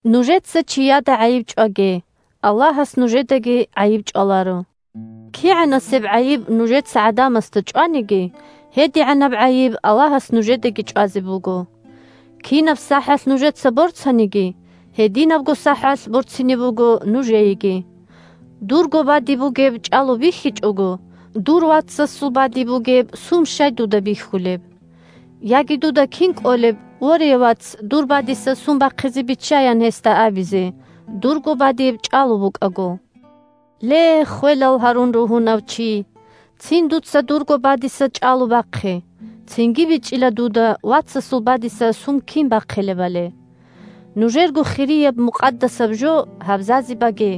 Нужеца чияда гӀайиб чӀваге, Аллагьас нужедаги гӀайиб чӀваларо. КигӀанасеб гӀайиб нужеца гӀадамасда чӀваниги, гьедигӀанаб гӀайиб Аллагьас нужедаги чӀвазе буго. Кинаб сахӀалъ нужеца борцаниги, гьединабго сахӀалъ борцине буго нужееги. Дурго бадиб бугеб чӀалу бихьичӀого, дур вацасул бадиб бугеб сум щай дуда бихьулеб? Яги дуда кин кӀолеб: «Ворея, вац, дур бадиса сум бахъизе биччай», – ян гьесда абизе, дурго бадиб чӀалу букӀаго? Ле, ххвелал гьарун ругьунав чи, цин дуца дурго бадиса чӀалу бахъе, цинги бичӀчӀила дуда вацасул бадиса сум кин бахъилебали. Нужерго хирияб-мукъадасаб жо гьабзазе баге,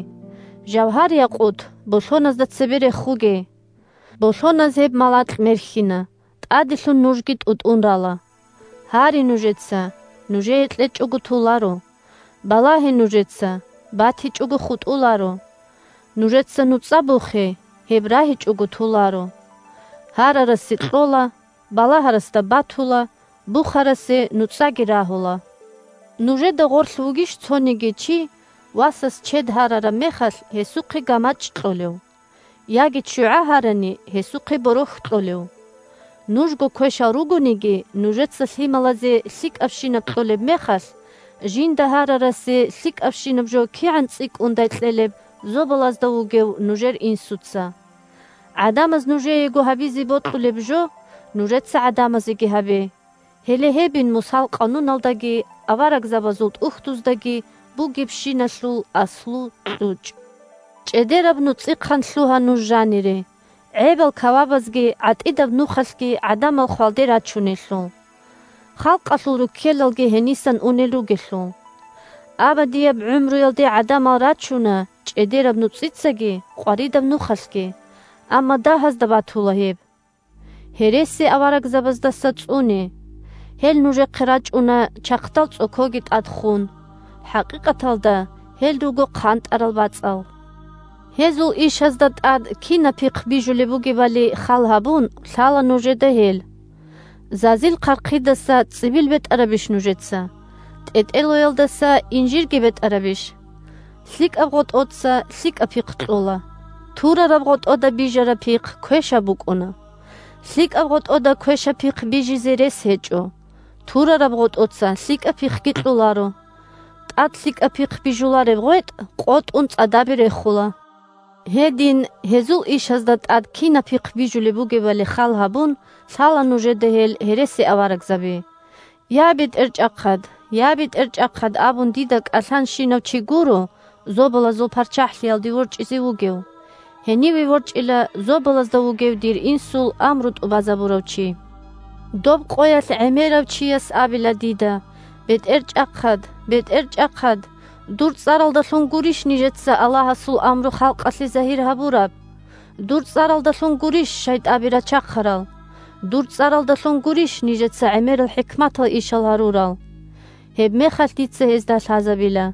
жавгьар-якъут болъоназда цебе рехуге. Болъоназ гьеб малакь мерхьина, тӀаделъун нужги тӀутӀун рала. Гьаре нужеца – нужее кьечӀого толаро; балагье нужеца – батичӀого хутӀуларо, нужеца нуцӀа бухе – гьеб рагьичӀого толаро. Гьарарасе кьола, балагьарасда батула, бухарасе нуцӀаги рагьула. Нужеда гъорлъ вугищ цониги чи, васас чед гьарараб мехалъ, гьесухъе гамачӀ кьолев? Яги ччугӀа гьарани, гьесухъе борохь кьолев? Нужго квешал ругониги, нужеца лъималазе лъикӀабщинаб кьолеб мехалъ, жинда гьарарасе лъикӀабщинаб жо кигӀан цӀикӀкӀундай кьелеб зобалазда вугев нужер Инсуца! ГӀадамаз нужеего гьабизе бокьулеб жо, нужеца гӀадамазеги гьабе. Гьеле гьебин Мусал Къануналдаги аварагзабазул ТӀухьдуздаги бугебщиналъул аслу-кьучӀ. ЧӀедераб нуцӀихъан лъугьа нуж жанире, – гӀебал кавабазги гӀатӀидаб нухалъги гӀадамал хвалде рачунелъул. Халкъалъул руккелалги гьенисан унел ругелъул. Абадияб гӀумруялде гӀадамал рачуна чӀедераб нуцӀицаги къваридаб нухалъги, амма дагьазда батула гьеб. ЦӀодорго рукӀа! Гьересиаварагзабаздаса цӀуне! Гьел нужехъе рачӀуна чахъдал цӀокоги тӀад ххун. ХӀакъикъаталда гьел руго хъантӀарал бацӀал. Гьезул ишазда тӀад кинаб пихъ бижулеб бугебали халгьабун, лъала нужеда гьел. Зазил хъархъидаса цӀибил бетӀарабищ нужеца, тӀетӀелоялдаса инжирги бетӀарабищ? ЛъикӀаб гъотӀоца лъикӀаб пихъ кьола, турараб гъотӀода бижараб пихъ квешаб букӀуна. ЛъикӀаб гъотӀода квешаб пихъ бижизе рес гьечӀо, турараб гъотӀоца лъикӀаб пихъги кьоларо. ТӀад лъикӀаб пихъ бижулареб гъветӀ къотӀун цӀадабе рехула. Гьедин, гьезул ишазда тӀад кинаб пихъ бижулеб бугебали халгьабун, лъала нужеда гьел гьересиаварагзаби. «Я, БетӀерчӀахъад! Я, БетӀерчӀахъад!» – абун дида кӀалъанщинав чи гуро Зобалазул ПарччахӀлъиялде ворчӀизе вугев. Гьениве ворчӀила зобалазда вугев дир Инсул амру тӀубазабурав чи. Доб къоялъ гӀемерав чияс абила дида: «БетӀерчӀахъад! БетӀерчӀахъад! Дур цӀаралдалъун гурищ нижеца Аллагьасул амру халкъалъе загьир гьабураб? Дур цӀаралдалъун гурищ шайтӀаби рачахъарал? Дур цӀаралдалъун гурищ нижеца гӀемерал хӀикматал ишал гьарурал?» Гьебмехалъ дица гьезда лъазабила: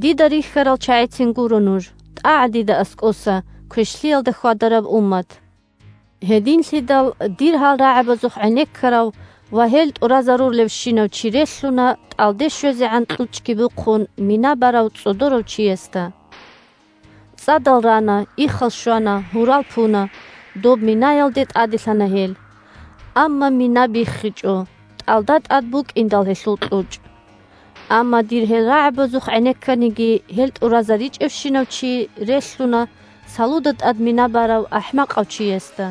«Дида рихьарал чагӀицин гуро нуж. ТӀагӀа дида аскӀоса, квешлъиялда хьвадараб уммат!» Гьединлъидал дир гьал рагӀабазухъ гӀенеккарав ва гьел тӀуразарулевщинав чи релълъуна, тӀалде щвезегӀан кьучӀги бухъун, мина барав цӀодорав чиясда. ЦӀадал рана, иххал щвана, гьурал пуна, – доб минаялде тӀаделъана гьел. Амма мина биххичӀо, тӀалда тӀад букӀиндал гьелъул кьучӀ. Амма дир гьел рагӀабазухъ гӀенекканиги, гьел тӀуразаричӀевщинав чи релълъуна салуда тӀад мина барав ахӀмакъав чиясда.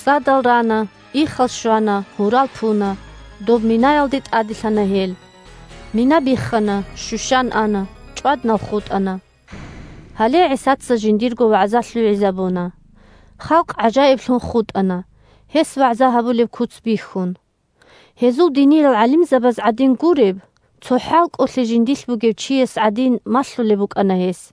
ЦӀадал рана, иххал щвана, гьурал пуна, – доб минаялде тӀаделъана гьел. Мина биххана, щущан ана, чӀваднал хутӀана. Гьале ГӀисаца жиндирго вагӀза лъугӀизабуна. Халкъ гӀажаиблъун хутӀана, гьес вагӀза гьабулеб куц бихьун. Гьезул диниял гӀалимзабаз гӀадин гуреб, цо хӀалкӀолъи жиндилъ бугев чияс гӀадин малъулеб букӀана гьес.